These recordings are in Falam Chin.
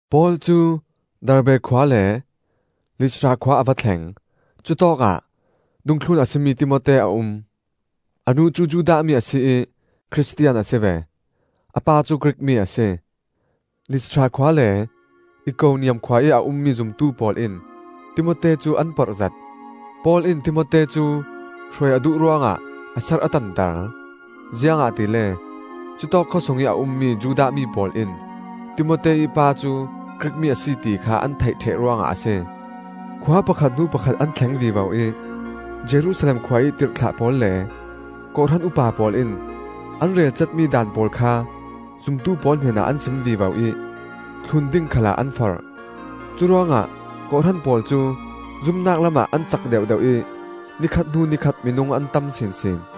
Paul cu Derbe khua le Listra khua a va thleng; cutawkah dungthlun a si mi Timote a um. A nu cu Judah mi a si ih Khristian a si ve, a pa cu Grik mi a si. Listra khua le Ikoniam khua ih a ummi zumtu pawl in Timote cu an porhzet. Paul in Timote cu hruai a duh ruangah a serh a tanter. Ziangahtile cutawk khawsungih a ummi Judah mi pawl in Timote ih pa cu Grik mi a si ti kha an theih ṭheh ruangah a si. Khua pakhat hnu pakhat an thleng vivo ih Jerusalem khua ih tirhthlah pawl le kawhhran upa pawl in an relcatmi daan pawl kha zumtu pawl hnenah an sim vivo ih thlun ding khalah an forh. Curuangah kawhhran pawl cu zumnak lamah an cak deuhdeuh ih ni khat hnu ni khat minung an tam sinsin.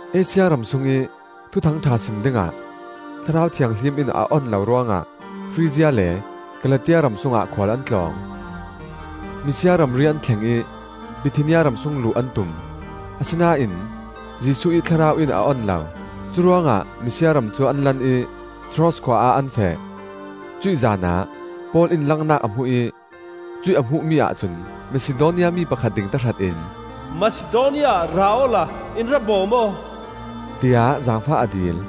Asia ram sungih Thuthang ṭha sim dingah Thlarau Thianghlim in a on lo ruangah Frizia le Kalatia ram sungah khual an tlawng. Misia ramri an thleng ih Bithinia ramsung luh an tum, asinain Jesuh ih Thlarau in a on lo. Curuangah Misia ram cu an lan ih Troas khua ah an feh. Cuih zanah Paul in langnak a hmu ih cuih a hmuhmi ahcun Masidonia mi pakhat ding tahratin, “Masidonia ah ra awla in ra bawm aw,” tiah zaangfah a dil.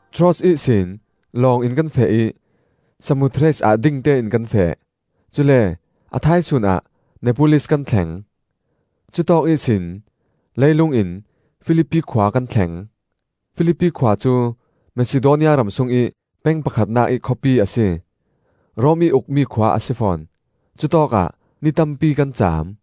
Troas ihsin lawng in kan feh ih Samothrace ah dingtein kan feh; cule a thaisun ah Neapolis kan thleng. Cutawk ihsin leilung in Filipi khua kan thleng. Filipi khua cu Masidonia ram sungih peng pakhatnak ih khawpi a si. Rom ih ukmi khua a si fawn. Cutawkah ni tampi kan caam.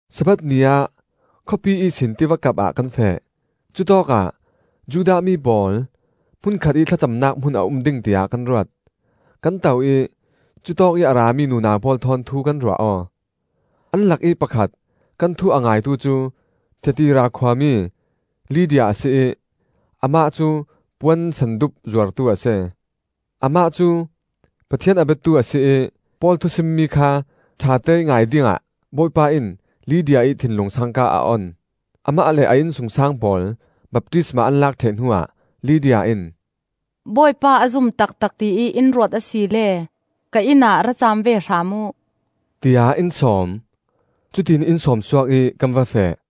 Sabbath ni ah khawpi ihsin tivakap ah kan feh; cutawkah Judah mi pawl hmun khatih thlacamnak hmun a um ding tiah kan ruat. Kan to ih cutawkih a rami nunau pawl thawn, thu kan ruah aw. An lakih pakhat, kan thu a ngaitu cu Thiatira khuami Lydia a si ih amah cu puan sendup zuartu a si. Amah cu Pathian a biatu a si ih Paul thusimmi kha ṭhateih ngai dingah Bawipa in Lydia ih thinlung sangka a on. Amah le a innsungsang pawl baptisma an lak ṭheh hnuah, Lydia in, “Bawipa a zum taktak tiih in ruat asile ka inn ah ra caam ve hram uh!” tiah in sawm. Cutiin in sawm suak ih kan va feh.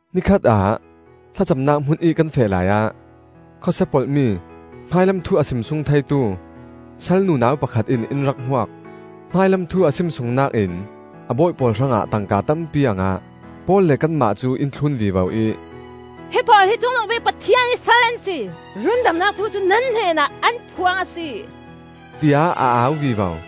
Ni khatah thlacamnak hmunih kan feh laiah, khawsia polhmi hmailam thu a simsung theitu sal nunau pakhat in in rak hmuak. Hmailam thu a simsungnak in a bawi pawl hrangah tangka tampi a ngah. Paul le kanmah cu in thlun vivo ih, “Himi pawl hi Cungnungbik Pathian ih sal an si! Rundamnak thu nan hnenah an phuang a si!” tiah a au vivo.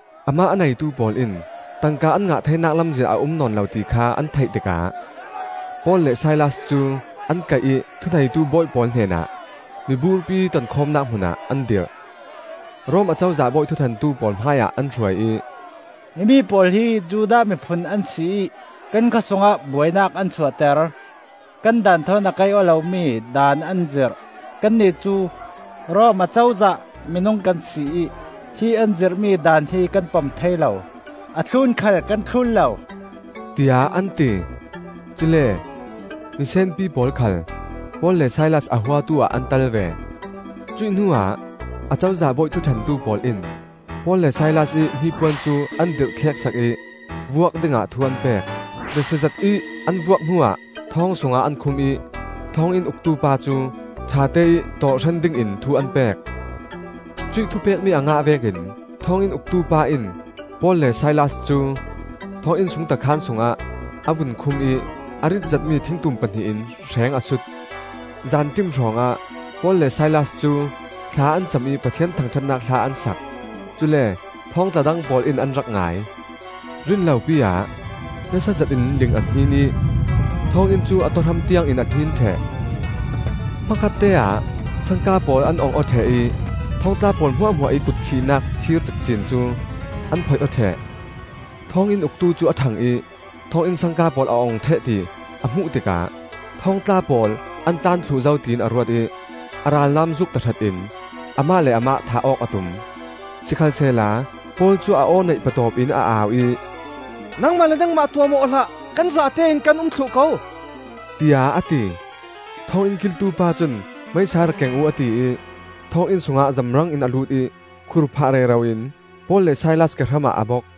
Amah a neitu pawl in tangka an ngah theinak lamzin a um nawn lo ti kha an theih tikah Paul le Silas cu an kaih ih thuneitu bawi pawl hnenah miburpi tonkhawmnak hmunah an dirh. Rom Acozah bawi thuṭhentu pawl hmaiah an hruai ih, “Himi pawl hi Judah mi phun an si ih kan khawsungah buainak an suahter. Kan daan thawn a kaih-aw lomi daan an zirh; kannih cu Rom Acozah minung kan si ih hi an zirhmi daan hi kan pom thei lo, a thlun khal kan thlun lo,” tiah an ti. Cule misenpi pawl khal Paul le Silas a huatu ah an tel ve. Cuih hnuah Acozah bawi thuṭhentu pawl in Paul le Silas ih hnipuan cu an dirhthleksak ih vuak dingah thu an pek. Besiazet ih an vuak hnuah thawng sungah an khum ih thawnginn uktu pa cu ṭhateih tawh hren dingin thu an pek. Cuih thupekmi a ngah vekin thawnginn uktu pa in Paul le Silas cu thawnginn sungta khaan sungah a vun khum ih a rit zetmi thingtum pahnih in hreng a sut. Zanṭim hrawngah Paul le Silas cu thla an cam ih Pathian thangṭhatnak hla an sak; cule thawngtla dang pawl in an rak ngai. Rinlopi-ah nasa zetin ling a hnin ih thawnginn cu a tawhram tiangin a hnin ṭheh. Hmakhatte-ah sangka pawl an ong aw ṭheh ih thawngtla pawl hmuahhmuah ih kut khihnak thir cikcin cu an phoih aw ṭheh. Thawnginn uktu cu a ṭhang ih thawnginn sangka pawl a ong ṭheh ti a hmuh tikah thawngtla pawl an tlan thluh zo tiin a ruat ih, a ralnam zuuk tahratin amah le amah thah awk a tum. Sikhalsehla Paul cu a aw neih patawp in a au ih, “Nangmah le nangmah tuahmawh aw hlah! Kan zatein kan um thluh ko,” tiah a ti. Thawnginn kiltu pa cun meisa rak keng uh, a ti ih thawnginn sungah zamrangin a lut ih khur phah rero in Paul le Silas kehram ah a bok.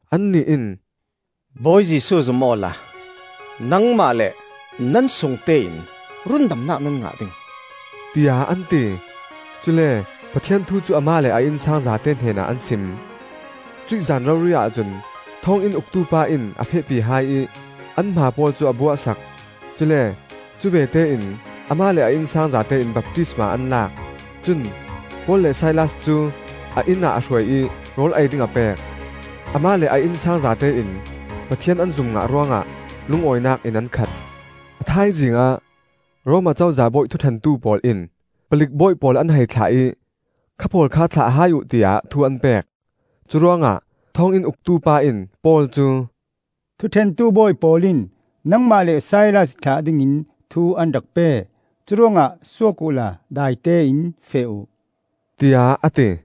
Annih in, “Bawi Jesuh zum awla nangmah le nan sungte in rundamnak nan ngah ding,” tiah an ti. Cule Pathian thu cu amah le a innsang zate hnenah an sim. Cuih zan rori-ah cun thawnginn uktu pa in a fehpi hai ih an hmaa pawl cu a buah sak; cule cuvete in amah le a innsang zatein baptisma an lak. Cun Paul le Silas cu a inn ah a hruai ih rawl ei ding a pek. Amah le a innsang zatein Pathian an zum ngah ruangah lungawinak in an khat. A thaizing ah Rom Acozah bawi thuṭhentu pawl in palik bawi pawl an hei thlah ih, “Kha pawl kha thlah hai uh,” tiah thu an pek. Curuangah thawnginn uktu pa in Paul cu, “Thuṭhentu bawi pawl in nangmah le Silas thlah dingin thu an rak pe. Curuangah suak uhla, daitein feh uh,” tiah a ti.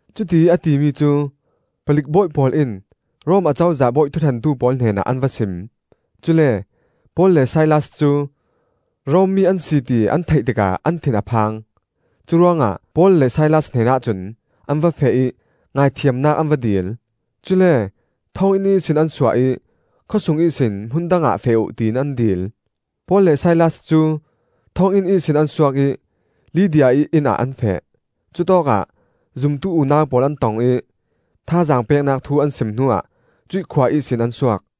Cutiih a timi cu palik bawi pawl in Rom Acozah bawi thuṭhentu pawl hnenah an va sim; cule Paul le Silas cu Rom mi an si ti an theih tikah an thin a phang! Curuangah Paul le Silas hnenah cun an va feh ih ngaithiamnak an va dil; cule thawnginn ihsin an suah ih khawsung ihsin hmun dangah feh uh, tiin an dil. Paul le Silas cu thawnginn ihsin an suak ih Lydia ih inn ah an feh. Cutawkah zumtu unau pawl an tong ih thazaang peknak thu an sim hnuah cuih khua ihsin an suak.